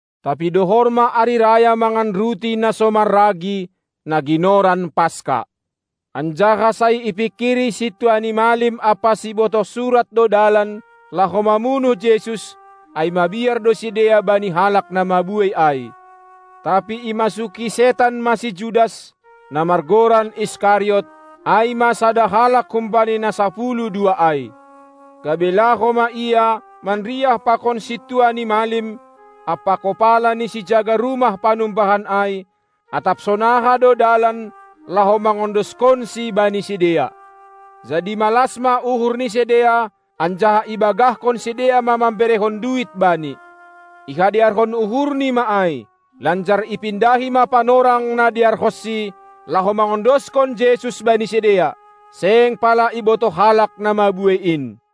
Tapi dohor ma ari raya mangan ruti na so marragi, na ginoran Paska. Anjaha sai ipingkiri sintua ni malim ampa sibotoh surat do dalan, laho mamunuh Jesus, ai mabiar do sidea bani halak na mabuei ai. Tapi imasuki setan ma si Judas, na margoran Iskariot, ai ma sada halak humbani na sapuluh dua ai. Gabe laho ma ia manriah pakon sintua ni malim ampa kopala ni sijaga rumah panumbahan ai, atap sonaha do dalan, laho mangondoskonSi bani sidea. Jadi malas ma uhur ni sidea, anjaha ibagahkon sidea ma mamberehon duit bani. Ihadearhon uhurni ma ai, lanjar ipindahi ma panorang na dearhonsi, laho mangondoskon Jesus bani sidea, seng pala ibotoh halak na mabuei in.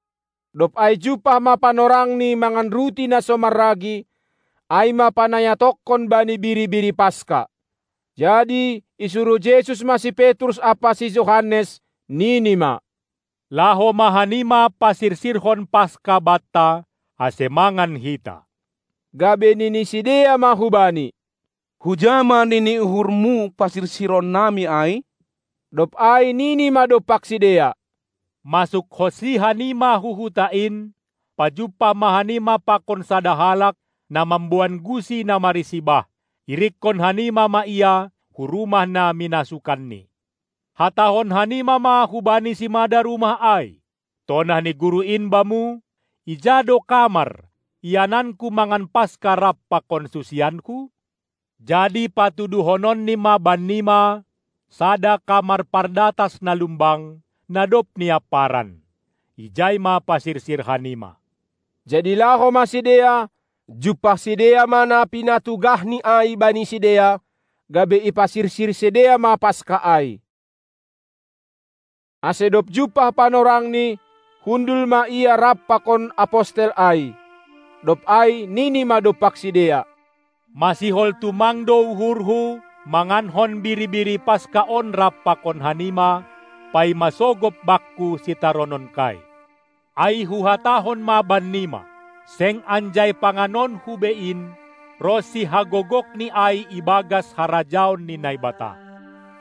Dob ai jumpah ma panorangni mangan ruti na so marragi, ai ma panayatonkon bani biri-biri Paska. Jadi isuruh Jesus ma si Petrus ampa si Johannes, Nini ma: Laho ma hanima pasirsirhon Paska banta, ase mangan hita. Gabe nini sidea ma hu Bani: Huja ma nini uhurMu parsirsiron nami ai? Dob ai nini ma dompak sidea: Masukhonsi hanima hu huta in, pajumpah ma hanima pakon sada halak na mamboan gusi na marisi bah; irikkon hanima ma ia hu rumah na minasukanni. Hatahon hanima ma hubani simada rumah ai: Tonah ni Guru in bamu: Ija do kamar, iananKu mangan Paska rap pakon susianKu? Jadi patuduhononni ma bannima sada kamar pardatas na lumbang, na dob niamparan; ijai ma pasirsir hanima. Jadi laho ma sidea, jumpah sidea ma na pinatugahni ai bani sidea, gabe ipasirsir sidea ma Paska ai. Ase dob jumpah panorangni, hundul ma Ia rap pakon Apostel ai. Dob ai Nini ma dompak sidea: Masihol tumang do uhurhu mangankon biri-biri Paska on rap pakon hanima, paima sogop Bakku sitarononKai. Ai Huhatahon ma bannima: Seng anjai panganonKu be in, ronsi hagogokni ai ibagas harajaon ni Naibata.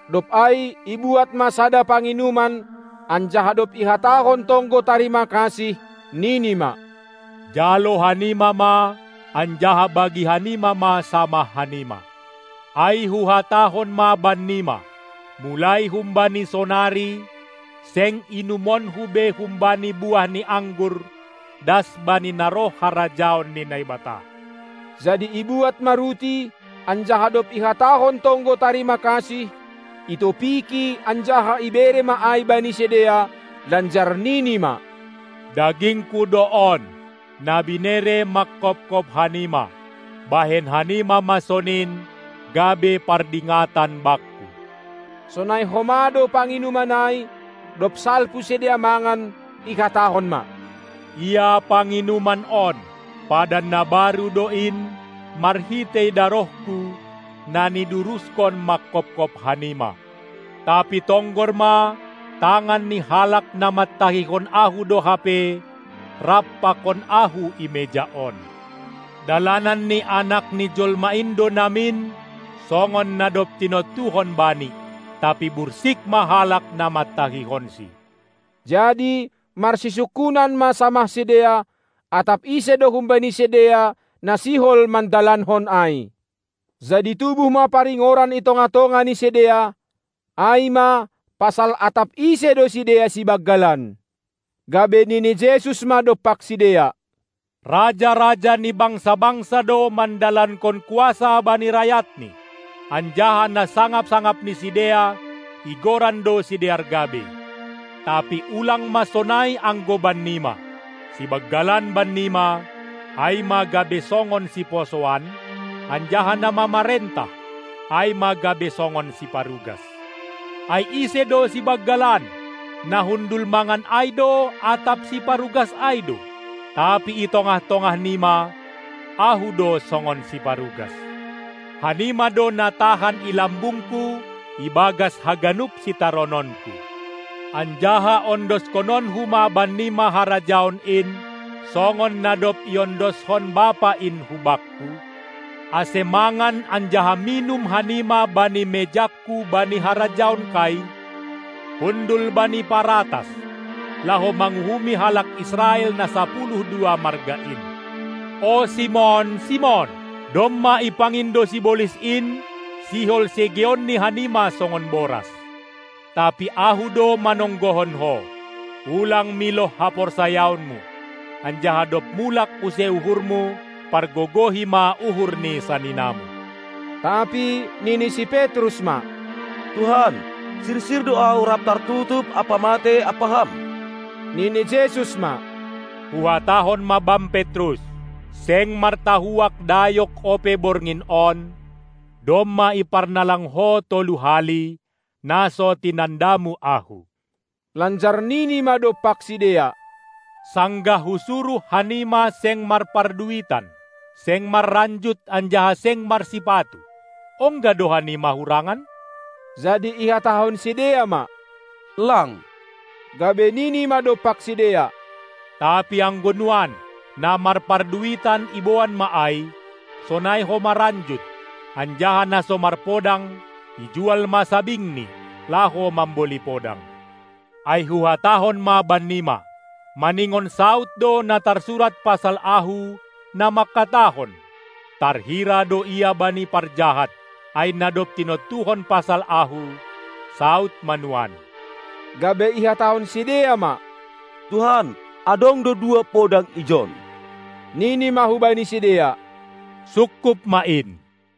Dob ai ibuat ma sada panginuman, anjaha dob ihatahon tonggo tarima kasih, nini ma: Jalo hanima ma, anjaha bagi hanima ma samah hanima! Ai Huhatahon ma bannima: Mulai humbani sonari, seng inumonKu be humbani buah ni anggur, das bani na roh harajaon ni Naibata. Jadi ibuat ma ruti, anjaha dob ihatahon tonggo tarima kasih, itopiki anjaha ibere ma ai bani sidea, lanjar Nini ma: DagingKu do on, na binere mangkopkop hanima; bahen hanima ma sonin, gabe pardingatan Bakku. Sonai homa do panginuman ai, dob salpu sidea mangan, ihatahon ma: Ia panginuman on, padan na baru do in, marhitei darohKu, na niduruskon mangkopkop hanima. Tapi tonggor ma, tangan ni halak na mantahihon Ahu do hape rap pakon Ahu i meja on! Dalanan ni Anak ni jolma in do namin songon na dob tinontuhon Bani, tapi bursik ma halak na mantahihonSi. Jadi marsisungkunan ma samah sidea, atap ise do humbani sidea na sihol mandalankon ai. Jadi tubuh ma paringoran i tongah-tongah ni sidea, ai ma pasal atap ise do sidea sibanggalan. Gabe nini Jesus ma dompak sidea: Raja-raja ni bangsa-bangsa do mandalankon kuasa bani rayatni, anjaha na sangap-sangap ni sidea igoran do sidear gabei. Tapi ulang ma sonai anggo bannima! Sibanggalan bannima, ai ma gabe songon siposoan, anjaha na mamarentah, ai ma gabe songon siparugas. Ai ise do sibanggalan, na hundul mangan ai do atap siparugas ai do? Tapi i tongah-tongah nima, Ahu do songon siparugas. Hanima do na tahan i lambungKu ibagas haganup sitarononKu. Anjaha ondoskononKu ma bannima Harajaon in, songon na dob iondoskon Bapa in hu Bakku, ase mangan anjaha minum hanima bani mejangKu bani harajaonKai, hundul bani paratas, laho manguhumi halak Israel na sapuluh dua marga in. O Simon, Simon, domma ipangindo sibolis in, sihol segeonni hanima songon boras. Tapi Ahu do manonggohon ho, ulang miloh haporsayaonmu, anjaha dob mulak use uhurmu, pargogohi ma uhur ni saninamu. Tapi nini si Petrus ma: Tuhan, sirsir do ahu rap tartutup ampa matei ampa Ham. Nini Jesus ma: Huhatahon ma bam Petrus: Seng martahuak dayok ope borngin on, domma iparnalang ho tolu hali, na so tinandamu Ahu. Lanjar nini ma dompak sidea: Sanggah Husuruh hanima seng marparduitan, seng marranjut anjaha seng marsipatu, ongga do hanima hurangan? Jadi ihatahon sidea ma: Lang! Gabe Nini ma dompak sidea: Tapi anggo nuan, na marparduitan iboan ma ai, sonai homa ranjut, anjaha na so marpodang, ijual ma sabingni, laho mamboli podang. Ai Huhatahon ma bannima: Maningon saud do na tarsurat pasal Ahu, na mangkatahon: Tarhira do Ia bani parjahat! Ai na dob tinontuhon pasal Ahu, saud ma nuan. Gabe ihatahon sidea ma: Tuhan, adong do dua podang ijon. Nini ma hubani sidea: Sungkup ma in!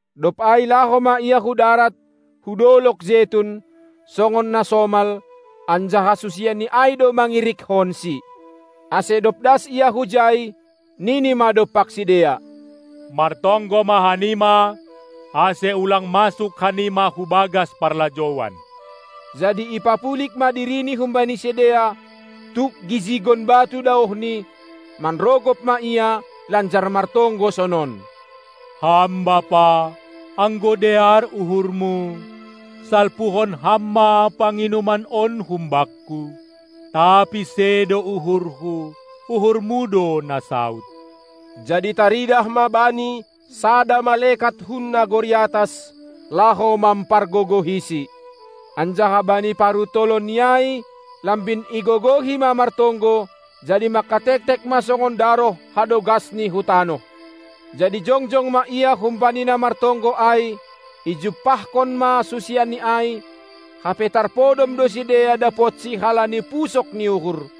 Dob ai laho ma Ia hu darat, hu dolog Jetun, songon na somal; anjaha susianNi ai do mangirikkonSi. Ase dob das Ia hujai, nini ma dompak sidea: Martonggo ma hanima, ase ulang masuk hanima hubagas parlajouan! Jadi ipapulig ma diriNi humbani sidea, tuk gijigon batu daohni; manrogop ma Ia lanjar martonggo sonon: Ham Bapa, anggo dear uhurMu, salpuhon Ham ma panginuman on hum Bakku! Tapi sedo uhurHu, uhurMu do na saud. Jadi taridah ma Bani sada malekat hun nagori atas, laho mampargogohiSi. Anjaha bani paruntolonNi ai, lambin igogohi ma martonggo, jadi mangkatektek ma songon daroh hadogasni hu tanoh. Jadi jongjong ma Ia humbani na martonggo ai, ijumpahkon ma susianNi ai, hape tarpodom do sidea dapotsi halani pusok ni uhur.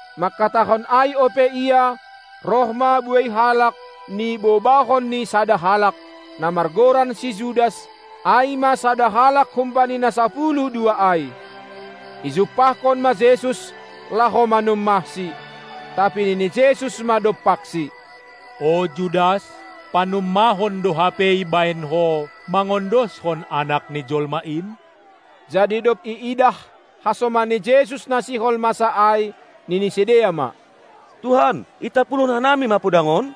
Mangkatahon ai ope Ia, roh ma buei halak, nibobahon ni sada halak, na margoran si Judas, ai ma sada halak humbani na sapuluh dua ai. Ijumpahkon ma Jesus, laho manummahSi. Tapi nini Jesus ma dompaksi: O Judas, panummahon do hape ibahen ho mangondoskon Anak ni jolma in? Jadi dob iidah hasoman ni Jesus na sihol masa ai, nini sidea ma: Tuhan, itampulhon hanami ma podang on?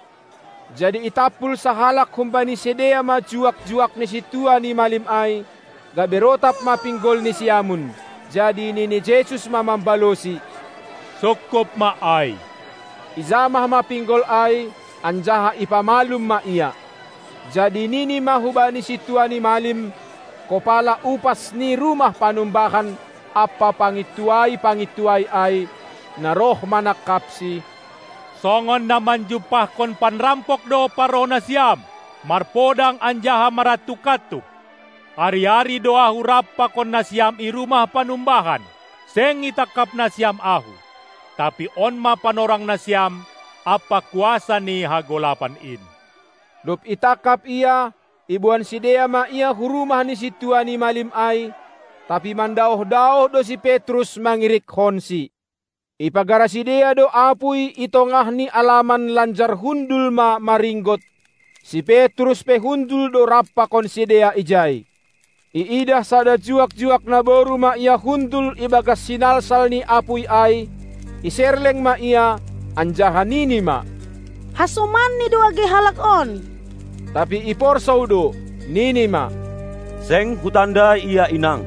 Jadi itampul sahalak humbani sidea ma juak-juak ni sintua ni malim ai, gabe rotap ma pinggolni siamun. Jadi nini Jesus ma mambalosi: Sungkup ma ai! Ijamah ma pinggol ai, anjaha ipamalum ma ia. Jadi nini ma hubani sintua ni malim, kopala upas ni rumah panumbahan ampa pangintuai-pangintuai ai, na roh manangkapsi: Songon na manjumpahkon panrampok do parroh nasiam, marpodang anjaha marantuk-antuk. Ari-ari do Ahu rap pakon nasiam i rumah panumbahan, seng itangkap nasiam Ahu. Tapi on ma panorang nasiam ampa kuasa ni hagolapan in. Dob itangkap Ia, iboan sidea ma Ia hu rumah ni sintua ni malim ai, tapi mandaoh-daoh do si Petrus mangirikkonsi. Ipagara sidea do apuy i tongah ni alaman lanjar hundul ma maringgot, si Petrus pe hundul do rap pakon sidea ijai. Iidah sada juak-juak naboru ma ia hundul ibagas sinalsal ni apuy ai, iserleng ma ia, anjaha nini ma: Hasomanni do age halak on! Tapi iporsou do, nini ma: Seng hutandai Ia, inang!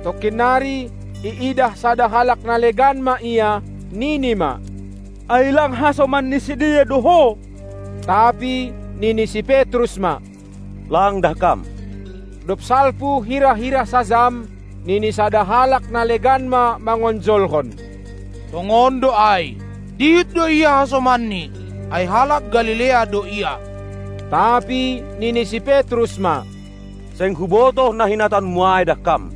Tongkin nari iidah sada halak na legan ma ia, nini ma: Ai lang hasoman ni sidea do ho? Tapi nini si Petrus ma: Lang, dahkam! Dob salpu hira-hira sajam, nini sada halak na legan ma mangonjolhon: Tongon do ai, dihut do ia hasomanni, ai halak Galilea do ia. Tapi nini si Petrus ma: Seng hubotoh na hinatahonmu ai, dahkam!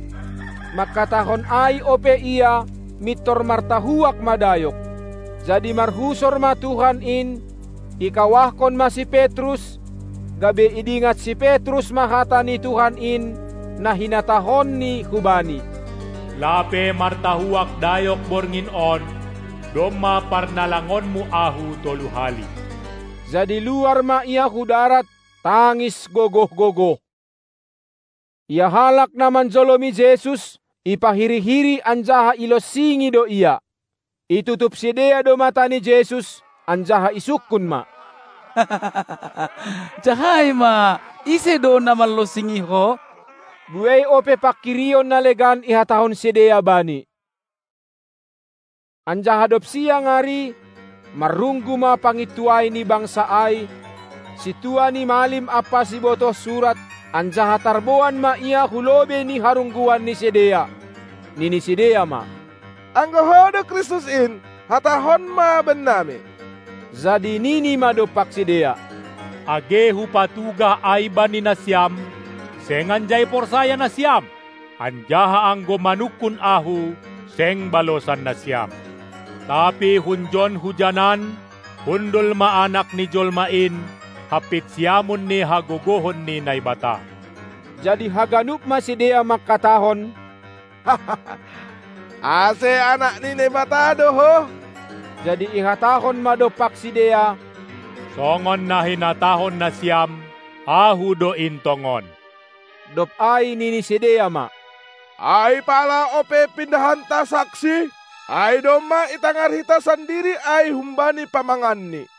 Mangkatahon ai ope ia, mintor martahuak ma dayok. Jadi marhusor ma Tuhan in, ikawahkon ma si Petrus, gabe idingat si Petrus ma hata ni Tuhan in, na hinatahonNi hubani: Lape martahuak dayok borngin on, domma, parnalangonmu Ahu tolu hali. Jadi luar ma ia hu darat, tangis gogoh-gogoh. Ia halak na manjolomi Jesus, ipahiri-hiri anjaha ilonsingi do Ia. Itutup sidea do mata ni Jesus anjaha isungkun ma: Jahai ma: Ise do na manlonsingi Ho? Buei ope panghirion na legan ihatahon sidea Bani. Anjaha dob siang ari, marrunggu ma pangintuai ni bangsa ai, sintua ni malim ampa sibotoh surat, anjaha tarboan ma Ia Hu lobei ni harungguan ni sidea. Nini sidea ma: Anggo Ho do Kristus in, hatahon ma bennami! Jadi nini ma dompak sidea: Age Hupatugah ai bani nasiam, seng anjai porsaya nasiam. Anjaha anggo manungkun Ahu, seng balosan nasiam. Tapi hunjon hujanan hundul ma Anak ni jolma in hampit siamun ni hagogohon ni Naibata. Jadi haganup ma sidea mangkatahon: Ase Anak ni Naibata do Ho? Jadi ihatahon ma dompak sidea: Songon na hinatahon nasiam: Ahu do in tongon! Dob ai nini sidea ma: Ai pala ope pindahanta saksi? Ai domma itangar hita sandiri ai humbani pamanganni.